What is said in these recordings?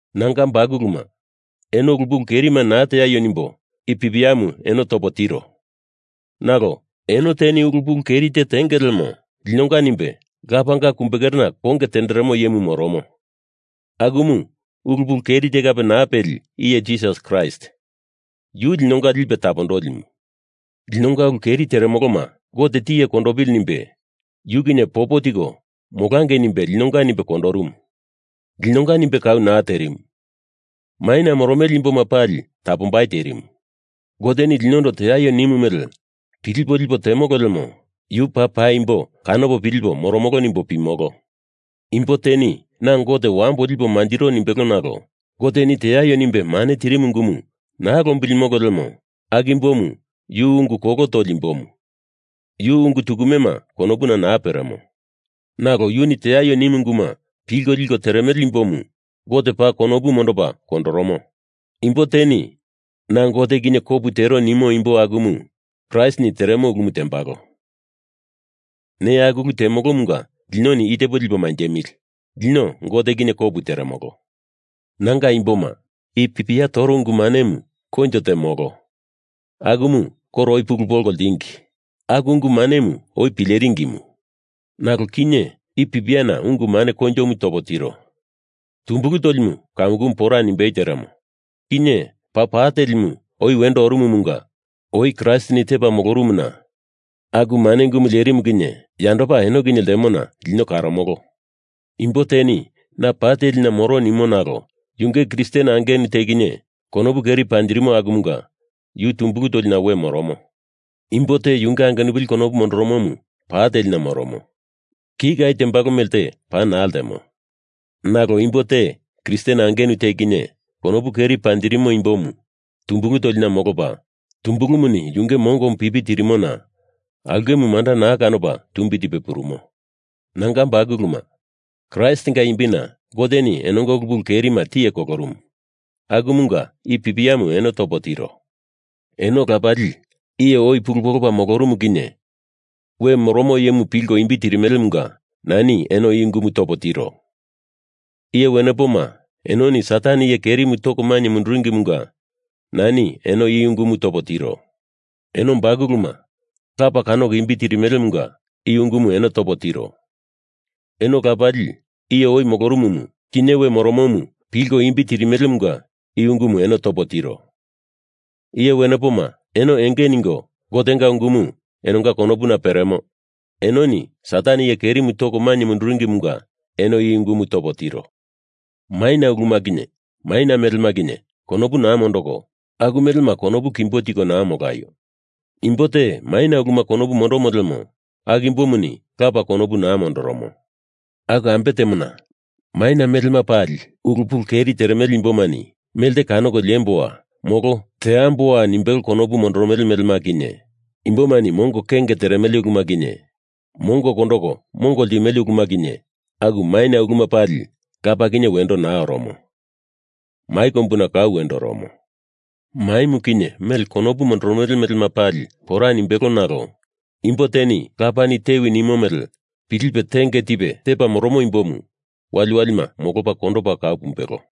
Nanga bakuluma, eno ulu pulu kerima naa teaio nimbo i pipiamu eno topo tiro. Nalo eno teni ulu pulu keri te tenge lemo linonga nimbe Lapanga kumbekerena konge tenderemo iyemu moromo. Akumu ulu pulu keri te kape naa peli iye Jisas Kraist. Yu linonga Lipe Tapondolimu. Linonga ulu keri teremoloma Gote tiye kondopili nimbe yu kinye popo tiko molangei nimbe linonga nimbe kolorumu. Linonga nimbe kau naa terimu. Maina moromele imboma pali tapombai terimu. Goteni linondo teaio nimu mele pilipo lipo temolo lemo Yu paa paimbo kanopo pilipo moromolo nimbo pimolo. Imbo teni na Gote wambo lipo manjiro nimbelo nalo Goteni teaio nimbe mane tirimu ungumu naa lombilimo lemo aku imbomu yu ungu kolo toli imbomu, yu ungu tukumema konopuna naa peremo. Nalo yuni teaio nimu unguma pilko liko teremele imbomu Gote paa konopu mondopa kondoromo. Imbo teni na Gote kinye kopu tero nimo imbo akumu Kraistini teremo ulumu tembalo. Neya aku ulu temolomunga linoni itepo lipo manjemili, lino Gote kinye kopu teremolo. Nanga imboma, i pipia toro ungu manemu koinjo te molo. Akumu koro oi pulu polko ltingi. Aku ungu manemu oi pileringimu. Nalo kinye i pipiana ungu mane koinjomu topo tiro. Tumbulu tolimu kamukumu pora nimbei teremo, kinye paa pa telimu oi wendo orumumunga oi Kraistini tepa molorumuna aku mane ungumu lerimu kinye yandopa eno kinye ltemona lino karomolo. Imbo teni na pa telina moro nimo nalo yunge Kristen angenu te kinye konopu keri panjirimo akumunga yu tumbulu tolina we moromo. Imbo te yunge angenupili konopu mondoromomu pa telina moromo. Kika tembalo melte pana naa ltemo. Nalo imbo te Kristen angenu te kinye konopu keri panjirimo imbomu tumbulu tolina molopa, tumbulumuni yunge mongomu pipi tirimona aulkemu manda naa kanopa tumbi tipe purumo. Nanga bakuluma, Kraistinga imbina Goteni enonga ulu pulu kerima tiye kolorumu, akumunga i pipiamu eno topo tiro. Eno lapali, iye oi pulu polopa molorumu kinye we moromo iyemu pilko imbi tirimelemunga nani eno i ungumu topo tiro. Iye wenepoma, enoni Satan iye kerimu toko mainye munduringimunga nani eno i ungumu topo tiro. Eno bakuluma, Lapa kanoko imbi tirimelemunga i ungumu eno topo tiro. Eno lapali, iye oi molorumumu kinye we moromomu pilko imbi tirimelemunga i ungumu eno topo tiro. Iye wenepoma, eno enge ningo, Gotenga ungumu enonga konopuna peremo, enoni Satan iye kerimu toko mainye munduringimunga eno i ungumu topo tiro. Maina uluma kinye maina melema kinye konopu naa mondoko, aku melema konopu kimbo tiko naa molaio! Imbo te maina uluma konopu mondomo lemo aku imbomuni lapa konopu naa mondoromo. Aku ambe temona, maina melema pali ulu pulu keri teremele imbomani melte kanoko liemboa molo teamboa nimbelo konopu mondoromele melema kinye, imbomani mongo kenge teremele uluma kinye, mongo kondoko mongo ltimele uluma kinye, aku maina uluma pali Lapa kinye wendo naa oromo. Mai kombuna kau wendo oromo. Maimu kinye mele konopu mondoromele melema pali pora nimbelo nalo imbo te Lapani tewi nimo mele pilipe tenge tipe tepa moromo imbomu waliwalima molopa kondopa kau pumbelo.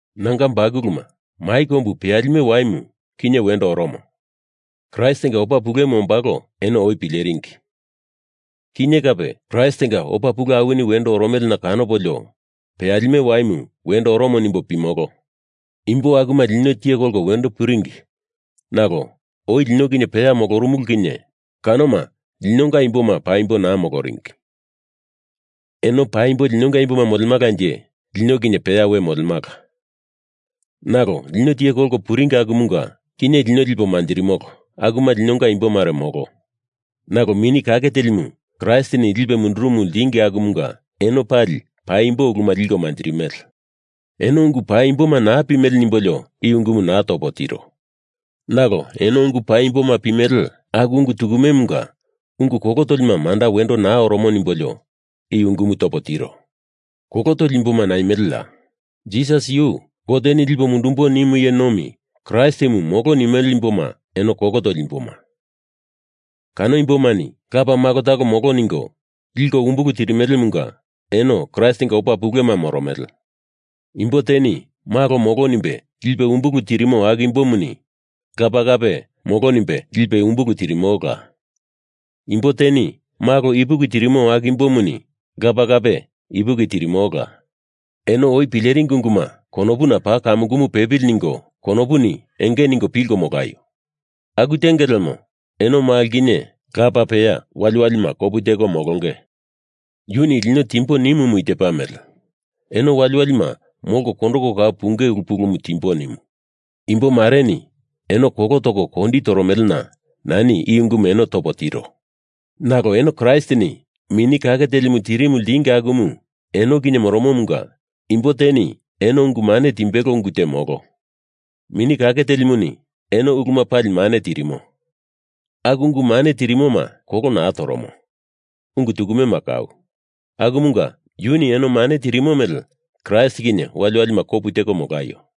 Nanga bakuluma, mai kombu peyalime waimu kinye wendo oromo. Kraistinga opa pulemu ombalo eno oi pileringi. Kinye kape Kraistinga opa pule awini wendo oromelena kanopolio peyalime waimu wendo oromo nimbo pimolo. Imbo akuma lino tiye kolko wendo puringi, nalo oi lino kinye peya molorumulu kinye kanoma linonga imboma paimbo naa moloringi. Eno paimbo linonga imboma molemalanje lino kinye peya we molemala. Nalo lino tiye kolko puringi akumunga kinye lipo manjirimolo akuma linonga imbo mare molo. Nalo Mini Kake Telimu Kraistini lipe mundurumu ltingi akumunga eno pali paimbo uluma liko manjirimele. Eno ungu paimboma naa pimele nimbolio i ungumu naa topo tiro. Nalo eno ungu paimboma pimele, aku ungu tukumemunga ungu kolo tolima manda wendo naa oromo nimbolio i ungumu topo tiro. Kolo toli imboma naimeleya? Jisas yu Goteni lipo mundumbo nimu iye nomi Kraistimu molo nimele imboma eno kolo toli imboma. Kano imbomani Lapa Malo talo molo ningo liko umbulu tirimelemunga eno Kraistinga opa pulema moromele. Imbo teni Malo molo nimbe lipe umbulu tirimo aku imbomuni Lapa kape molo nimbe lipe umbulu tirimola. Imbo teni Malo ipuki tirimo aku imbomuni Lapa kape ipuki tirimola. Eno oi pileringi unguma konopuna paa kamukumu pepili ningo konopuni enge ningo pilko molaio! Aku tenge lemo eno Malo kinye Lapa peya waliwalima kopu teko molonge. Yuni lino timbo nimumu i tepa mele: Eno waliwalima molko kondoko kau punge ulu pulumu timbo nimu. Imbo mareni eno kolo toko kondi toromelena nani i ungumu eno topo tiro. Nalo eno Kraistini Mini Kake Telimu tirimu ltingi akumu eno kinye moromomunga imbo teni eno ungu mane timbelo ungu te molo. Mini Kake Telimuni eno uluma pali mane tirimo. Aku ungu mane tirimoma kolo naa toromo, ungu tukumema kau. Akumunga yuni eno mane tirimo mele Kraist kinye waliwalima kopu teko molaio!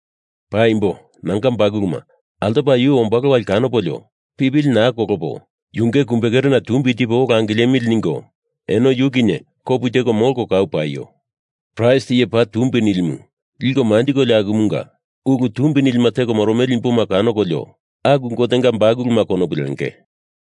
Paimbo, nanga bakuluma altopa yu ombalo wali kanopolio pipili naa kolopo yunge kumbekerena tumbi tipo ola angilemili ningo eno yu kinye kopu teko molko kau paio! Kraist Iye Paa Tumbi Nilimu liko manjikolio akumunga ulu tumbi nilima teko moromele imboma kanokolio aku Gotenga bakuluma konopu lenge.